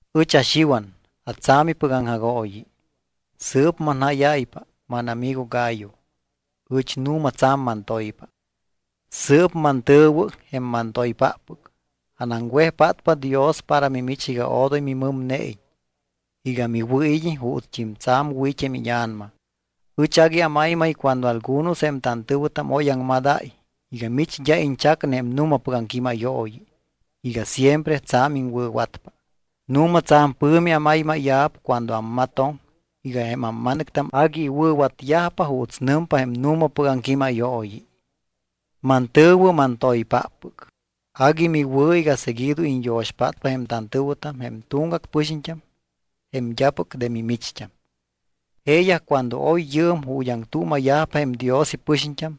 Ɨch aXiwan atsa̱mipɨc aŋjagooyi. Sɨɨp manjáyáypa, mánamigo Gayo, ɨch nu̱ma tsa̱m mantoypa. Sɨɨp mantɨ̱wɨ, jém mantoypáppɨc, anaŋwejpátpa Dios para mimich iga odoy mimɨmneiñ, iga miwɨ̱id́iñ juutst́im tsa̱m wɨ̱ it́ jém íña̱nama. Ɨch agui amaymay cuando algunos jém tantɨ̱wɨtam oy aŋmadáy iga mich d́a iñchacne jém nu̱mapɨc aŋquímayooyi, iga siempre tsa̱m iŋwɨ̱watpa. Nu̱ma tsa̱m pɨ̱mi amaymáya̱p cuando ammatoŋ iga jém amma̱nɨctam agui iwɨ̱watyajpa juuts nɨmpa jém nu̱mapɨc aŋquímayooyi. Mantɨ̱wɨ, mantoypáppɨc, agui miwɨ̱ iga seguido iñyo̱xpátpa jém tantɨ̱wɨtam jém tuŋgac pɨxiñt́am jém d́apɨc de mimicht́am. Jeeyaj cuando oy yɨɨm ju̱t́ aŋtuuma̱yajpa jém Dios ipɨxiñt́am,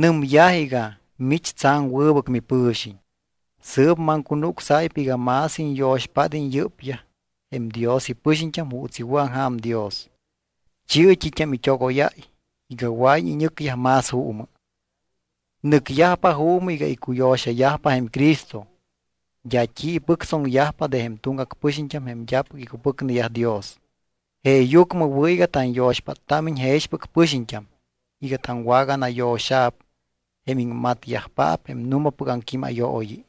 nɨmyaj iga mich tsa̱m wɨbɨc mipɨ̱xiñ. Sɨɨp maŋcunucsáypa iga más iñyo̱xpád́iñ yɨ́pyaj jém Dios ipɨxiñt́am juuts iwɨ̱aŋja̱m Dios. Chi̱ɨ t́it́am it́ogóyáy iga wɨa̱iñ iñɨcyaj más juumɨ. Nɨcyajpa juumɨ iga icuyo̱xayajpa jém Cristo. D́a t́i ipɨctsoŋyajpa de jém tuŋgac pɨxiñt́am jém d́apɨc icupɨcneyaj Dios. Jeeyucmɨ wɨ̱ iga tanyo̱xpáttámiñ jexpɨc pɨxiñt́am iga taŋwaganayo̱xa̱p jém iŋmatyajpaap jém nu̱mapɨc aŋquímayooyi.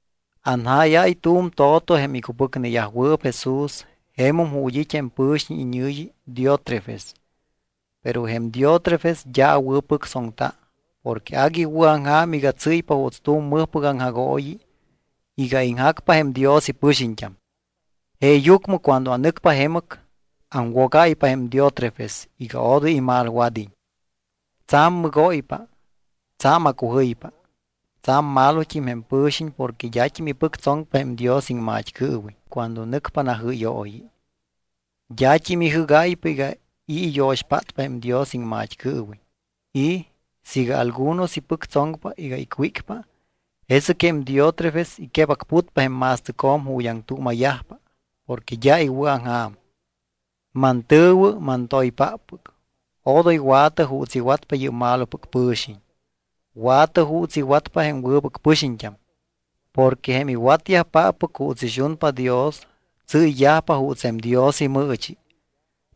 Anjáyáy tu̱m to̱to jém icupɨcneyajwɨɨp Jesús jemum ju̱t́ it́ jém pɨ̱xiñ iñɨ̱yi Diótrefes. Pero jém Diótrefes d́a awɨ̱pɨctsoŋta porque agui iwɨ̱aŋja̱m iga tsɨ́ypa juuts tu̱m mɨjpɨc aŋjagooyi iga iŋjacpa jém Dios ipɨxiñt́am. Jeeyucmɨ cuando anɨcpa jemɨc, aŋwogáypa jém Diótrefes iga odoy imalwad́iñ. Tsa̱m mɨgóypa, tsa̱m acujɨypa. Tsa̱m malot́im jém pɨ̱xiñ porque d́at́im ipɨctsoŋpa jém Dios iŋmat́cɨɨwiñ cuando nɨcpa najɨ́yooyi. D́at́im ijɨ́gáypa iga i̱ iyo̱xpátpa jém Dios iŋmat́cɨɨwiñ. Y siiga algunos ipɨctsoŋpa iga icwícpa, jesɨc jém Diótrefes iquebacputpa jém ma̱stɨcjo̱m ju̱t́ aŋtuuma̱yajpa porque d́a iwɨ̱aŋja̱m. Mantɨ̱wɨ, mantoypáppɨc, odoy wa̱tɨ juuts iwatpa yɨ́p malopɨc pɨ̱xiñ. Wa̱tɨ juuts iwatpa jém wɨbɨc pɨxiñt́am. Porque jém iwatyajpáppɨc juuts ixunpa Dios tsɨ́yyajpa juuts jém Dios imɨɨchi.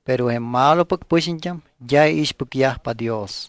Pero jém malopɨc pɨxiñt́am d́a iixpɨcyajpa Dios.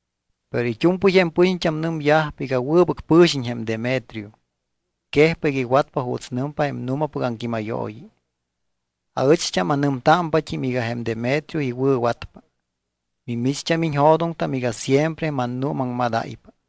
Pero it́u̱mpɨy jém pɨxiñt́am nɨmyajpa iga wɨbɨc pɨ̱xiñ jém Demetrio. Quejpa iga iwatpa juuts nɨmpa jém nu̱mapɨc aŋquímayooyi. Aɨcht́am anɨmtámpat́im iga jém Demetrio iwɨ̱watpa. Mimicht́am iñjo̱doŋtam iga siempre mannuumaŋmadáypa.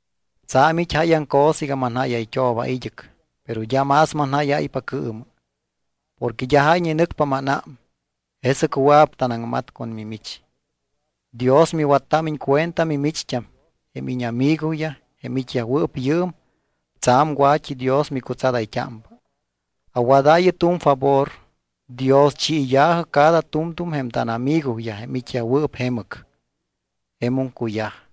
Tsa̱m it́ jáyaŋ cosa iga manjáyayt́ooba id́ɨc, pero d́a más manjáyáypa cɨɨmɨ. Porque d́a jáyñe nɨcpa mánám. Jesɨc wɨa̱p tanaŋmat con mimich. Dios miwattámiñ cuenta mimicht́am. Jém íñamigoyaj, jém it́yajwɨɨp yɨɨm, tsa̱m wa̱t́idios micutsadayt́ámpa. Awadaayɨ tu̱m favor. Dioschiya̱jɨ cada tu̱mtu̱m jém tánamigoyaj jém it́yajwɨɨp jemɨc. Jemum cuyaj.